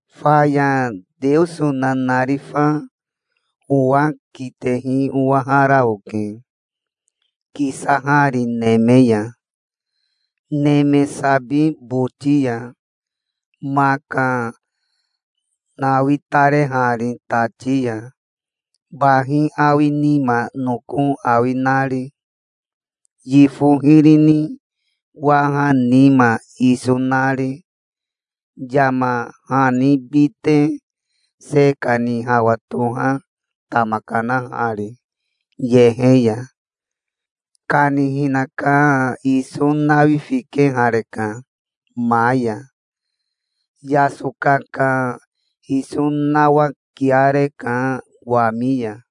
Faya Teoso nanarifa owa kitehi owahara oke, kisahari neme ya, neme sabi boti ya, maka nawitarehari tati ya, bahi awi nima noko awi nari, yifo hiri ni waha nima iso nari, yama hani bite se kani hawa toha tama kanahari yehe ya. Kanihina ka iso nawifikehareka ma ya. Yasoka ka iso nawakiareka wami ya.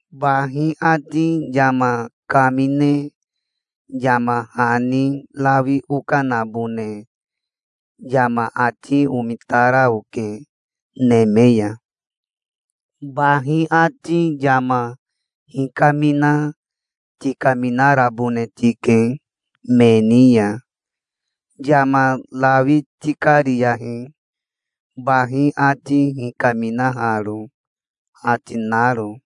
Bahi ati yama kamine yama hani rawi okanabone yama ati omitara oke neme ya, "Bahi ati yama hikamina tikaminarabone tike me ni ya. Yama rawi tikariyahi, bahi ati hikaminaharo", ati naro.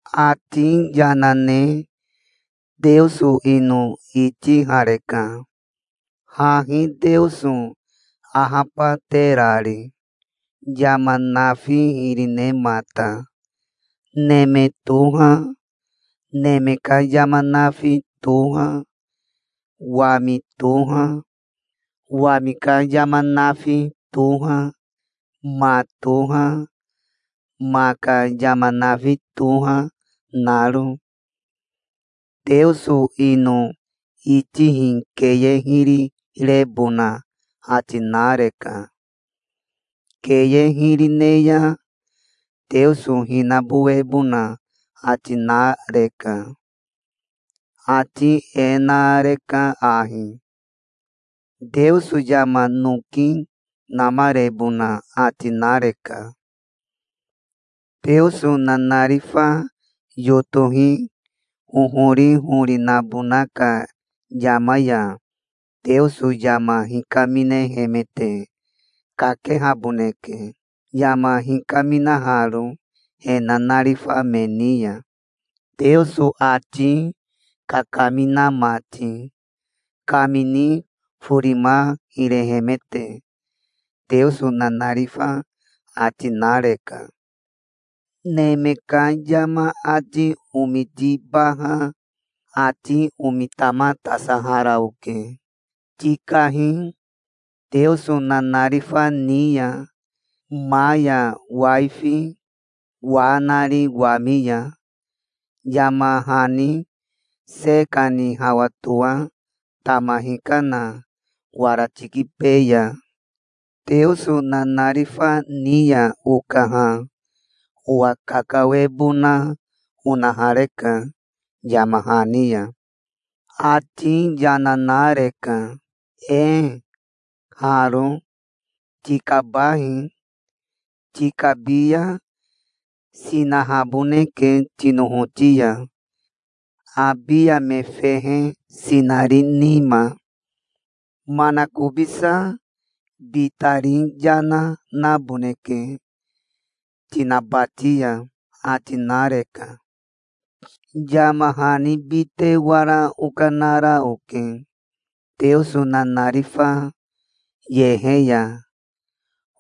Ati yana ne Teoso ino itihareka, hahi Teoso ahabaterari, yama nafi hiri nemata, neme toha, neme ka yama nafi toha, wami toha, wami ka yama nafi toha, ma toha, ma ka yama nafi toha, naro. Teoso ino itihi keye hiri rebona ati nareka. Keye hiri ne ya Teoso hinabowebona ati nareka. Ati e nareka ahi: "Teoso yama noki namarebona ati nareka. Teoso nanarifa yotohi hohori hori nabona ka yama ya Teoso yama hikaminehemete kakehaboneke, yama hikaminaharo he nanarifa me ni ya, Teoso ati kakamina mati, kamini forima hirehemete", Teoso nanarifa ati nareka. Neme ka yama ati omitibaha ati omitamatasahara oke. "Tikahi, Teoso nanarifa ni ya, ma ya waifi, wa nari wami ya, yama hani se kani hawa toa tama hikana wara tikibeya". Teoso nanarifa ni ya okaha owa kakawebona onahareka yama hani ya. Ati yana nareka. "Ee, haro. Tikabahi. Tikabi ya sinahaboneke tinohoti ya, abiya me fehe sinari nima. Manakobisa bitari yana naboneke tinabati ya", ati nareka. Yama hani bite wara okanara oke Teoso nanarifa yehe ya,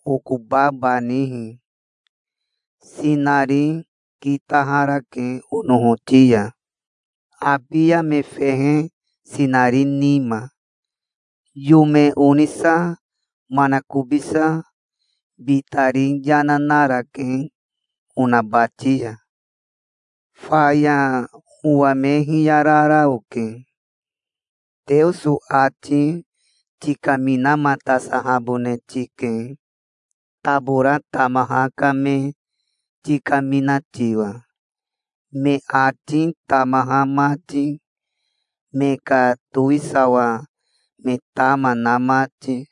okobabanihi. Sinari kitaharake onohoti ya, abiya me fehe sinari nima. Yome onisa manakobisa bitari yana narake onabati ya. Faya owa me hiyarara oke. "Teoso ati tikaminamatasahabone tike, tabora tamaha ka me tikamina tiwa, me ati tamaha mati, me ka towisawa me tama na mati".